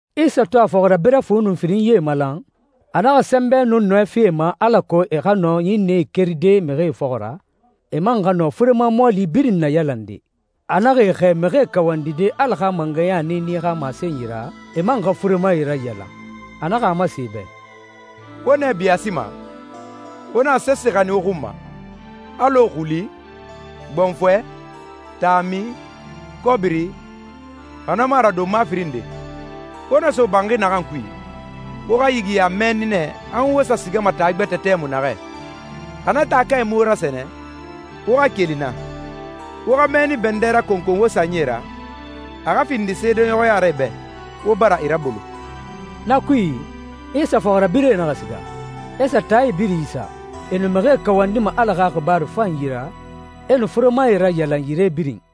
Isa to a fɔxirabirɛ fu nun firinyie malan, a naxa sɛnbɛ nun nɔɛ fi e ma alako e xa nɔ ɲinnɛe keride mixie fɔxɔ ra, e man xa nɔ furema mɔɔli birin nayalande. A naxa e xɛɛ mixie kawandide Ala xa mangɛya niini xa masenyi ra, e man xa furemae rayalan. A naxa a masen e bɛ, «Wo nɛ biyaasima, wo naxa sese xanin wo xun ma, alɔ xuli, gbɔnfɔɛ, taami, kɔbiri, xa na mu a ra donma firin nde. Wo na so banxi naxan kui, wo xa yigiya mɛnni nɛ han wo sa sigama taa gbɛtɛ tɛmui naxɛ. Xa na taakae mu wo rasɛnɛ, wo xa keli naa. Wo xa mɛnni bɛndɛ rakɔnkɔn wo sanyie ra, a xa findi seedeɲɔxɔya ra e bɛ, wo bara e rabolo.» Na kui, Isa fɔxirabirɛe naxa siga, e sa taae birin isa. E nu mixie kawandima Ala xa xibaaru fanyi ra, e nu furemae rayalan yire birin.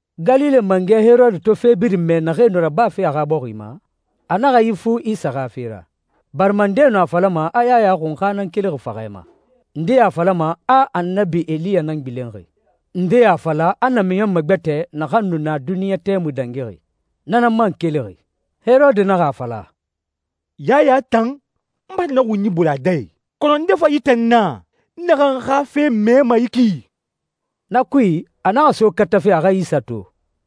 Galile mangɛ Herode to fe birin mɛ naxee nu rabafe a xa bɔxi ma, a naxa ifu Isa xa fe ra, barima ndee nu a falama a Yaya Xunxa nan kelixi faxɛ ma, ndee a fala a Annabi Eliya nan gbilenxi, ndee a fala a namiɲɔnmɛ gbɛtɛ naxan nu na duniɲɛ tɛmui dangixi, na nan man kelixi. Herode naxa a fala, «Yaya tan, n bara na xunyi bolon a dɛ i. Kɔnɔ nde fa yi tan na, n naxan xa fe mɛma yi ki?» Na kui, a naxa so katafe a xa Isa to.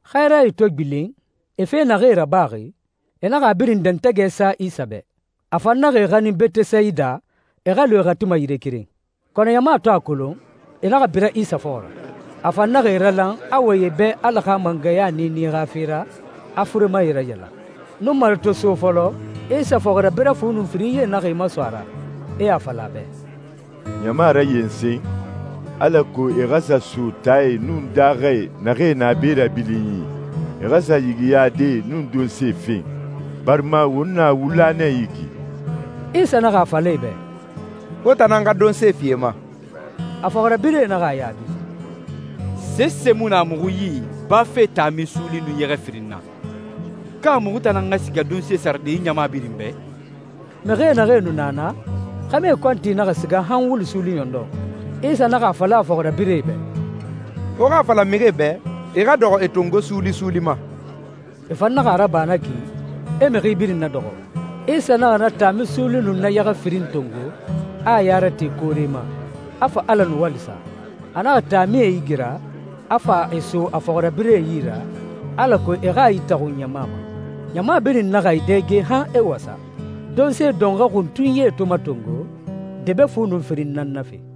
Xɛɛrae to gbilen, e fe naxee rabaxi, e naxa a birin dɛntɛgɛ sa Isa bɛ. A fan naxa e xanin Betesayida e xa lu e xati ma yire keren. Kɔnɔ ɲama to a kolon, e naxa bira Isa fɔxɔ ra. A fan naxa e ralan, a wɔyɛn e bɛ Ala xa mangɛya niini xa fe ra, a furemae rayalan. Nunmare to so fɔlɔ, Isa fɔxirabirɛ fu nun firinyie naxa e maso a ra, e a fala a bɛ, «Ɲama rayensen alako e xa sa so taae nun daaxae naxee na be rabilinyi, e xa sa yigiyadee nun donsee fen, barima won na wula nɛ yi ki.» Isa naxa a fala e bɛ, «Wo tan nan xa donse fi e ma.» A fɔxirabirɛe naxa a yaabi, «Sese mu na muxu yi bafe taami suuli nun yɛxɛ firin na. Ka muxu tan nan xa siga donse sarade yi ɲama birin bɛ?» Mixie naxee nu na naa, xɛmɛe kɔnti naxa siga han wulu suuli ɲɔndɔn. Isa naxa a fala a fɔxirabirɛe bɛ, «Wo a fala mixie bɛ e xa dɔxɔ e tongo suuli suuli ma.» E fan naxa a raba na ki, e mixi birin nadɔxɔ. Isa naxa na taami suuli nun na yɛxɛ firin tongo, a a ya rate koore ma, a fa Ala nuwali sa. A naxa taamie igira, a fa e so a fɔxirabirɛe yi ra, alako e xa e itaxun ɲama ma. Ɲama birin naxa e dɛge han e wasa. Donse dɔnxɔɛ xuntunyie to matongo, debe fu nun firin nan nafe.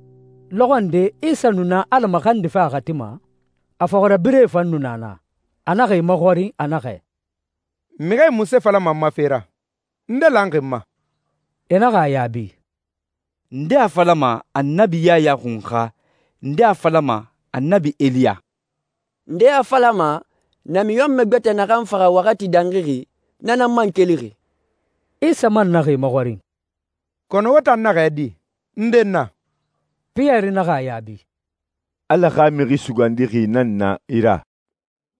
Lɔxɔ nde Isa nu na Ala maxandife a xati ma. A fɔxirabirɛe fan nu na naa. A naxa e maxɔrin, a naxɛ, «Mixie munse falama n ma fe ra? Nde lanxi n ma?» E naxa a yaabi, «Ndee a falama, Annabi Yaya Xunxa. Ndee a falama, Annabi Eliya. Ndee a falama, namiɲɔnmɛ gbɛtɛ naxan faxa waxati dangixi, na nan man kelixi.» Isa man naxa e maxɔrin, «Kɔnɔ wo tan naxɛ di? Nde n na?» Piyɛri naxa a yaabi, «Ala xa Mixi Sugandixi nan na i ra.»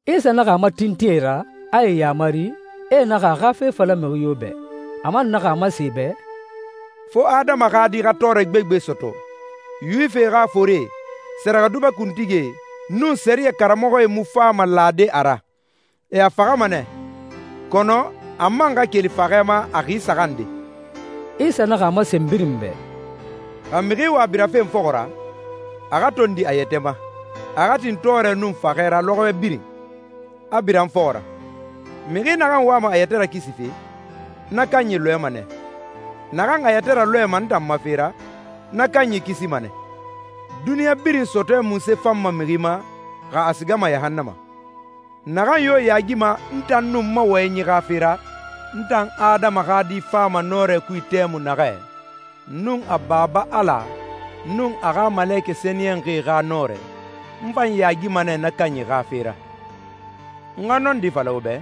Isa naxa a matintin e ra, a e yamari, e naxa a xa fe fala mixi yo bɛ. A man naxa a masen e bɛ, «Fo Adama xa Di xa tɔɔrɛ gbegbe sɔtɔ. Yuwifie xa forie, sɛrɛxɛdubɛ kuntigie, nun sɛriyɛ karamɔxɔe mu fama lade a ra, e a faxama nɛ, kɔnɔ a man xa keli faxɛ ma a xi saxan nde.» Isa naxa a masen birin bɛ, «Xa mixi wa birafe n fɔxɔ ra, a xa tondi a yɛtɛ ma, a xa tin tɔɔrɛ nun faxɛ ra lɔxɔɛ birin, a bira n fɔxɔ ra. Mixi naxan wama a yɛtɛ rakisife, na kanyi lɔɛma nɛ. Naxan a yɛtɛ ralɔɛma n tan ma fe ra, na kanyi kisima nɛ. Duniɲa birin sɔtɔɛ munse fanma mixi ma, xa a sigama yahannama? Naxan yo yaagima n tan nun n ma wɔyɛnyi xa fe ra, n tan Adama xa Di fama a nɔrɛ kui tɛmui naxɛ nun a Baba Ala nun a xa malekɛ sɛniyɛnxie xa nɔrɛ, n fan yaagima nɛ na kanyi xa fe ra. N xa nɔndi fala wo bɛ,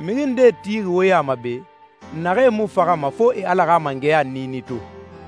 mixi ndee tixi wo ya ma be, naxee mu faxama fo e Ala xa mangɛya niini to.»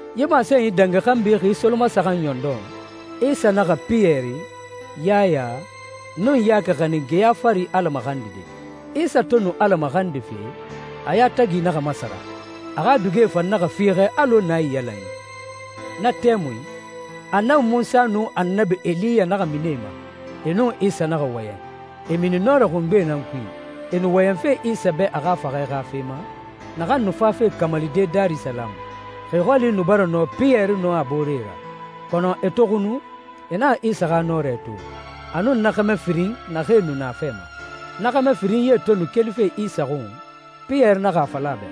Yi masenyi dangi xanbi xi solomasaxan ɲɔndɔn, Isa naxa Piyɛri, Yaya, nun Yaki xanin geya fari Ala maxandide. Isa to nu Ala maxandife, a yatagi naxa masara. A xa dugie fan naxa fiixɛ alɔ naiyalanyi. Na tɛmui, Annabi Munsa nun Annabi Eliya naxa mini e ma, e nun Isa naxa wɔyɛn. E mini nɔrɛ xungbe nan kui, e nu wɔyɛnfe Isa bɛ a xa faxɛ xa fe ma, naxan nu fafe kamalide Darisalamu. Xi xɔli nu bara nɔ Piyɛri nun a booree ra, kɔnɔ e to xunu, e naxa Isa xa nɔrɛ to, a nun na xɛmɛ firin naxee nu na a fɛ ma. Na xɛmɛ firinyie to nu kelife Isa xun, Piyɛri naxa a fala a bɛ,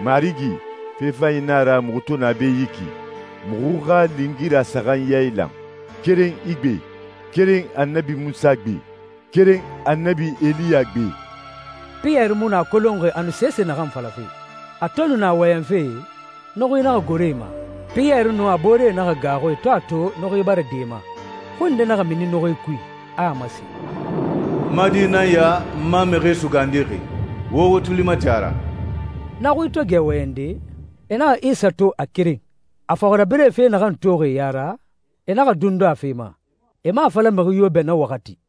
«Marigi, fe fanyi na a ra muxu to na be yi ki. Muxu xa lingira saxan yailan, keren i gbe, keren Annabi Munsa gbe, keren Annabi Eliya gbe.» Piyɛri mu nu a kolonxi a nu sese naxan falafe. A to nu na wɔyɛnfe, nuxui naxa goro e ma. Piyɛri nun a booree naxa gaaxu e to a to nuxui bara din e ma. Xui nde naxa mini nuxui kui, a a masen, «N ma Di nan ya, n ma Mixi Sugandixi. Wo wo tuli mati a ra.» Na xui to gɛ wɔyɛnde, e naxa Isa to a keren. A fɔxirabirɛe fe naxan toxi e ya ra, e naxa dundu a fe ma, e mu a fala mixi yo bɛ na waxati.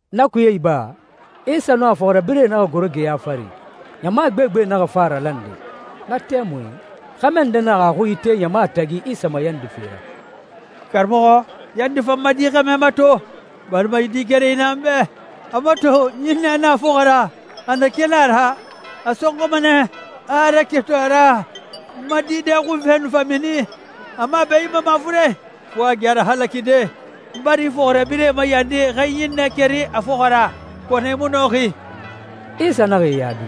Na kuye iba, Isa nun a fɔxirabirɛe naxa goro geya fari, ɲama gbegbe naxa fa a ralande. Na tɛmui, xɛmɛ nde naxa a xui ite ɲama tagi Isa mayandife ra, «Karamɔxɔ, yandi, fa n ma di xɛmɛ mato, barima yi di kerenyi nan na n bɛ! A mato, ɲinnɛ nan na a fɔxɔ ra. A na keli a ra, a sɔnxɔma nɛ, a a raketun a ra, n ma di dɛxunfɛ nu fa mini. A mu a bɛɲinma mafuren, fo a gɛ a rahalakide. N bara i fɔxirabirɛe mayandi e xa yi ɲinnɛ keri a fɔxɔ ra, kɔnɔ e mu nɔxi.» Isa naxa e yaabi,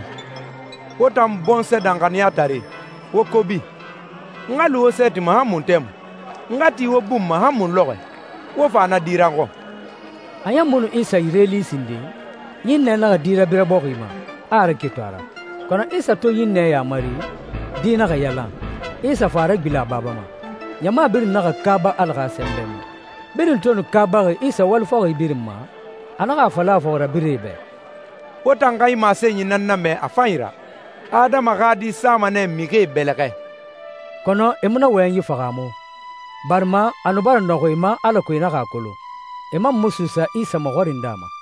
«Wo tan bɔnsɔɛ danxaniyatare, wo kobi. N xa lu wo sɛɛti ma han mun tɛmui? N xa ti wo bun ma han mun lɔxɔɛ? Wo fa na di ra n xɔn.» A ɲan mu nu Isa yire li sinden, ɲinnɛ naxa di rabira bɔxi ma, a a raketun a ra. Kɔnɔ Isa to ɲinnɛ yamari, di naxa yalan, Isa fa a ragbilen a baba ma. Ɲama birin naxa kaaba Ala xa sɛnbɛ ma. Birin to nu kaabaxi Isa wali fɔxi birin ma, a naxa a fala a fɔxirabirɛe bɛ, «Wo tan xa yi masenyi nan namɛ a fanyi ra: Adama xa Di sama nɛ mixie bɛlɛxɛ.» Kɔnɔ e mu na wɔyɛnyi fahaamu, barima a nu bara nɔxun e ma alako e naxa a kolon. E man mu suusa Isa maxɔrinde a ma.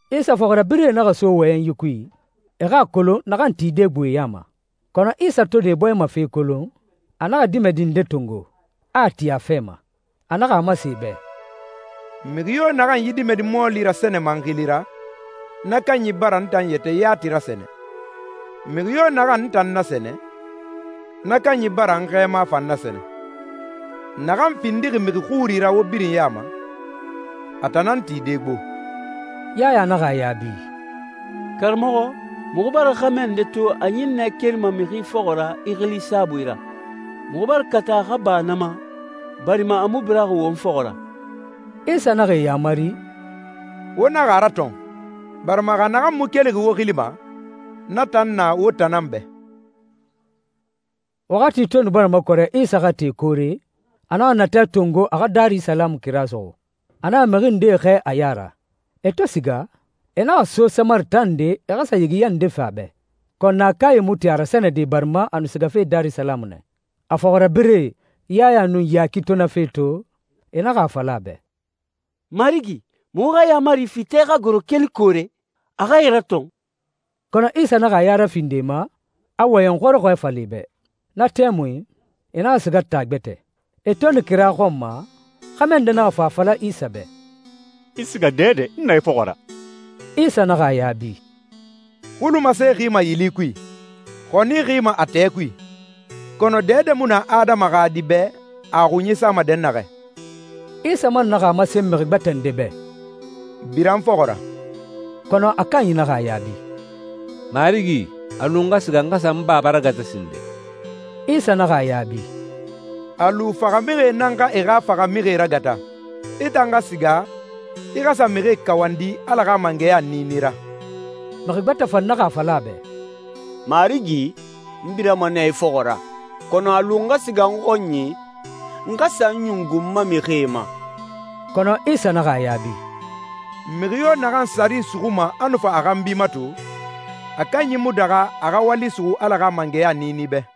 Isa fɔxirabirɛe naxa so wɔyɛnyi kui, e xa a kolon naxan tide gbo e ya ma. Kɔnɔ Isa to nu e bɔɲɛ ma fe kolon, a naxa dimɛdi nde tongo, a a ti a fɛ ma. A naxa a masen e bɛ, «Mixi yo naxan yi dimɛdi mɔɔli rasɛnɛma n xili ra, na kanyi bara n tan yɛtɛ yati rasɛnɛ. Mixi yo naxan n tan nasɛnɛ, na kanyi bara n xɛɛma fan nasɛnɛ. Naxan findixi mixi xuri ra wo birin ya ma, a tan nan tide gbo.» Yaya naxa a yaabi, «Karamɔxɔ, muxu bara xɛmɛ nde to a ɲinnɛ kerima mixi fɔxɔ ra i xili saabui ra. Muxu bara kata a xa ba na ma, barima a mu biraxi won fɔxɔ ra.» Isa naxa e yamari, «Wo naxa a ratɔn, barima xa naxan mu kelixi wo xili ma, na tan na wo tan na bɛ.» Waxati to nu bara makɔrɛ Isa xa te koore, a naxa natɛ tongo a xa Darisalamu kira suxu. A naxa mixi ndee xɛɛ a ya ra. E to siga, e naxa so Samari taa nde e xa sa yigiya nde fen a bɛ. Kɔnɔ naakae mu tin a rasɛnɛde barima a nu sigafe Darisalamu nɛ. A fɔxirabirɛe Yaya nun Yaki to na fe to, e naxa a fala a bɛ, «Marigi, muxu xa yaamari fi tɛ xa goro keli koore, a xa e ratɔn?» Kɔnɔ Isa naxa a ya rafindi e ma, a wɔyɛn xɔrɔxɔɛ fala e bɛ. Na tɛmui, e naxa siga taa gbɛtɛ. E to nu kira xɔn ma, xɛmɛ nde naxa fa a fala Isa bɛ, «I siga dɛdɛ, n na i fɔxɔ ra.» Isa naxa a yaabi, «Xulumase xima yili kui. Xɔni xima a tɛɛ kui. Kɔnɔ dɛdɛ mu na Adama xa Di bɛ a a xunyi sama dɛnnaxɛ.» Isa man naxa a masen mixi gbɛtɛ nde bɛ, «Bira n fɔxɔ ra.» Kɔnɔ a kanyi naxa a yaabi, «Marigi, a lu n xa siga, n xa sa n baba ragata sinden.» Isa naxa a yaabi, «A lu faxamixie nan xa e xa faxamixie ragata. I tan xa siga, i xa sa mixie kawandi Ala xa mangɛya niini ra.» Mixi gbɛtɛ fan naxa a fala a bɛ, «Marigi, n birama nɛ i fɔxɔ ra, kɔnɔ a lu n xa siga n xɔnyi, n xa sa n ɲungu n ma mixie ma.» Kɔnɔ Isa naxa a yaabi, «Mixi yo naxan saari suxuma a nu fa a xanbi mato, a kanyi mu daxa a xa wali suxu Ala xa mangɛya niini bɛ.»